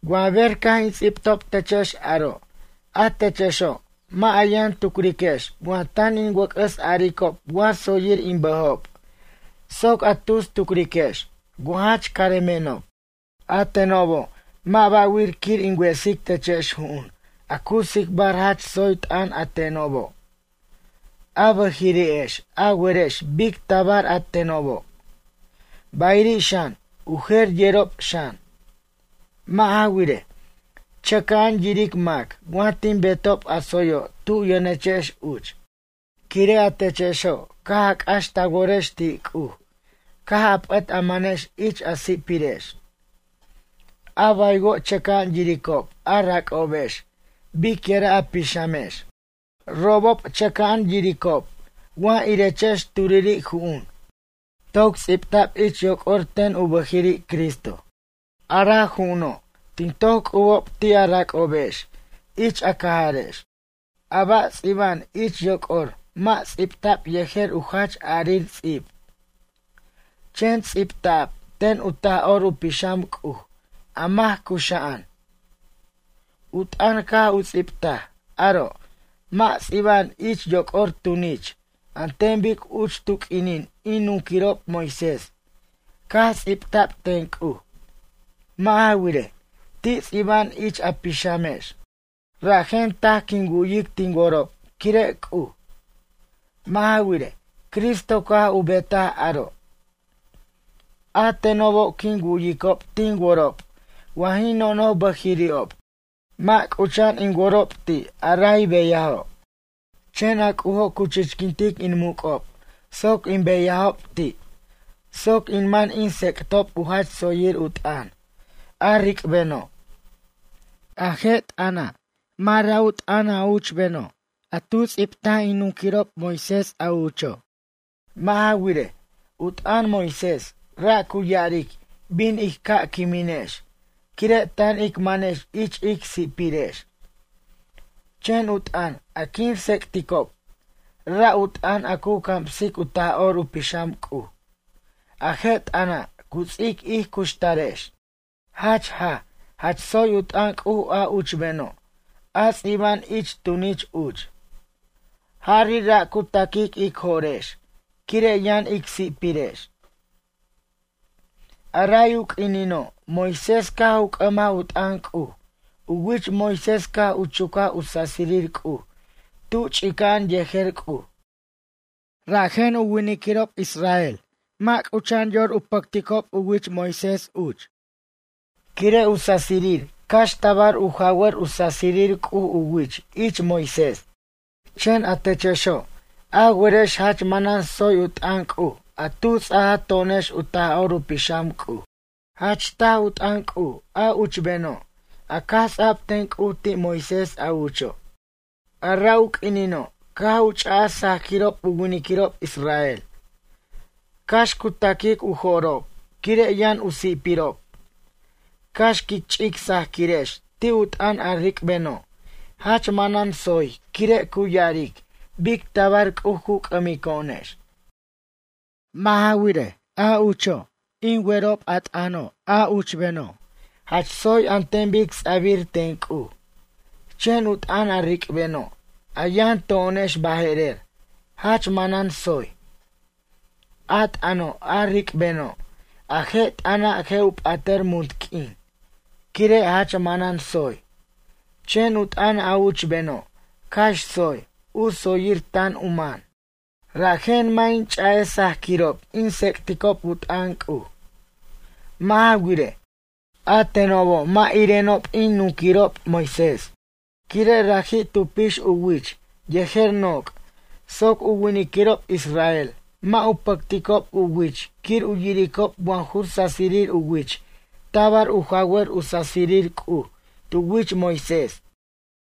Wa ber caj in ts'ibtob techex aro', a techexo' mʌ' a yʌn turiquex wa tan in wʌc'ʌs aricob wa tsoyir in bʌjob soc a tus tucriquex wa jach caremenob. A tenobo' mʌ' ba' wir quir in wesic techex ju'un a cu tsicbar jach tsoy t'ʌn a tenobo'. A bʌjiri'ex a werex bic tabar a tenobo', bayiri' xan u jer yerob xan. Mʌ' ja wirej, chʌca'an yiric mac wa tin betob a tsoyo' tu yʌnechex uch, quire' a techexo' caj a c'ax ta worex ti' C'uj caj a p'ʌt a manex ich a si'pirex. A baywo' chʌca'an yiricob a rac'obex biquira' a pixamex. Robob chʌca'an yiricob wa irechex turiri' ju'un toc ts'ibta'b ich yoc'or ten u bʌjiri' Cristo. A ra' ju'uno' tin toc c'ubob ti' a rac'obex ich a cajarex. A ba' ts'iba'an ich yoc'or mʌ' ts'ibta'b yejer u jach a'arir ts'ib, chen ts'ibta'b ten u Taj'or u Pixam C'uj a mac cuxa'an. U t'ʌn caj u ts'ibtaj aro' mʌ' ts'iba'an ich yoc'or tunich an ten bic uch tu q'uinin in nunquirob Moisés caj ts'ibta'b ten C'uj. Mʌ' ja wirej, ti' ts'iba'an ich a pixamex. Rajen taj quin wu'yic tin worob quire' C'uj. Mʌ' ja wirej, Cristo caj u betaj aro'. A tenobo' quin wu'yicob tin worob wa jin nonoj bʌjiri'ob mʌ' c'ucha'an in worob ti' a ray beyajo', chen a C'ujo' cu chichquintic in muc'ob soc in beyajob ti' soc in man in tsec'tob u jach tsoyir u t'ʌn, a ric'beno'. A je' t'ʌna', mʌ' ra' u t'ʌn a uchbeno' a tu ts'ibt in nunquirirob Moisés a ucho'. Mʌ' ja wirej, u t'ʌn Moisés ra' cu ya'aric bin ij ca' quiminex quire' tan ic manex ich ic si'pirex. Chen u t'ʌn a quin tsec'ticob ra' u t'ʌn a cu camsic u Taj'or u Pixam C'uj. A je' t'ʌna' cu ts'ic ij cuxtarex. Jach jaj jach tsoy u t'ʌn C'uj a uchbeno' a ts'iba'an ich tunich uch. Jari' ra' cu taquic ic jo'rex quire' yʌn ic si'pirex. A ray u q'uinino' Moisés caj u c'ʌmaj u t'ʌn C'uj, u wich Moisés caj u chucaj u sasirir C'uj tu ch'ica'an yejer C'uj. Rajen u winiquirob israel mʌ' c'ucha'an yor u pʌcticob uch u wich Moisés quire' u sasirir cax tabar u jawʌr u sasirir C'uj u wich ich Moisés. Chen a techexo' a werex jach manan tsoy u t'ʌn C'uj a tu ts'aja to'onex u Taj'or u Pixam C'uj. Jach taj u t'ʌn C'uj a uchbeno' a caj ts'ab ten C'uj ti' Moisés a ucho'. A ra' u q'uinino' caj u ch'aj sajquirob u winiquirob israel. Cax cu ta'quic u jo'rob quire' yʌn u si'pirob, cax quic ch'ic sajquirex ti' u t'ʌn a ric'beno', jach manan tsoy quire' cu ya'aric bic tabar C'uj cu c'ʌmico'onex. Mʌ' ja wirej, a ucho' jin werob a t'ʌno' a uchbeno' jach tsoy an ten bic ts'abir ten C'uj, chen u t'ʌn a ric'beno', a yʌn to'onex baje'rer jach manan tsoy. A t'ʌno' a ric'beno', a je' t'ʌna' je' u p'atʌr munt q'uin quire' jach manan tsoy. Chen u t'ʌn a uchbeno' cax tsoy, u tsoyir tan u man. Rajen mʌ' in ch'a'ej sajquirob in tsec'ticob u t'ʌn C'uj. Mʌ' ja wirej, a tenobo' mʌ' irenob in nunquirob Moisés, quire' raji' tu pix u wich yejer noc' soc u winiquirob israel mʌ' u pʌcticob u wich quir u yiricob wa ju sasir u wich tabar u jawar u sasirir C'uj tu wich Moisés.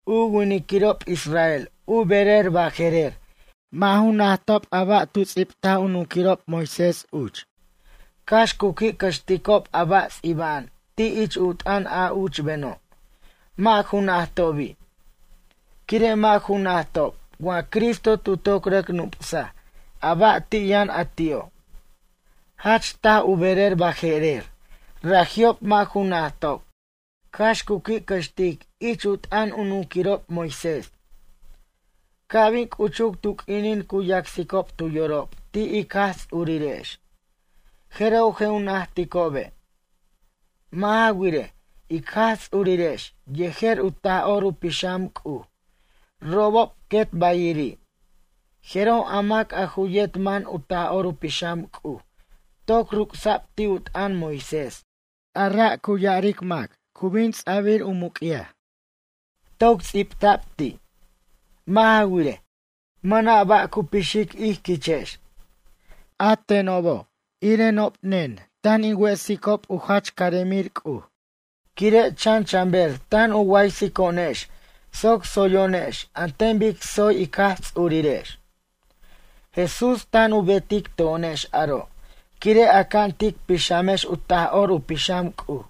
U winiquirob israel u berer baje'rer mʌ' ju najtob a ba' tu ts'ibt u nunquirob Moisés uch, cax cu qui' cʌxticob a ba' ts'iba'an ti' ich u t'ʌn a uchbeno', mʌ' ju najtobi'. Quire' mʌ' ju najtob wa Cristo tu toc rʌc nup'saj a ba' ti' yʌn a ti'o'. Jach taj u berer baje'rer raji'ob mʌ' ju najtob cax cu qui' cʌxtic ich u t'ʌn u nunquirob Moisés. Ca' bin c'uchuc tu q'uinin cu yacsicob tu yorob ti' ic Jaj Ts'urirex, jeroj je' u najticobe'. Mʌ' ja wirej, ic Jaj Ts'urirex yejer u Taj'or u Pixam C'uj robob quet bayiri'. Jeroj a mac a ju yet man u Taj'or u Pixam C'uj toc ruc'sa'b ti' u t'ʌn Moisés, a ra' cu ya'aric mac cu bin ts'a'bir u muc'yaj. Toc sipta'b ti'. Mʌ' ja wirej, mʌna' ba' cu pixic ij quichex. A tenobo' irenob nen tan in wesicob u jach caremir C'uj. Quire' chan chanber tan u waysico'onex soc tsoyo'onex an ten bic tsoy ic Jaj Ts'ururex. Jesús tan u betic to'onex aro' quire' aca'an tic pixamex u Taj'or u Pixam C'uj.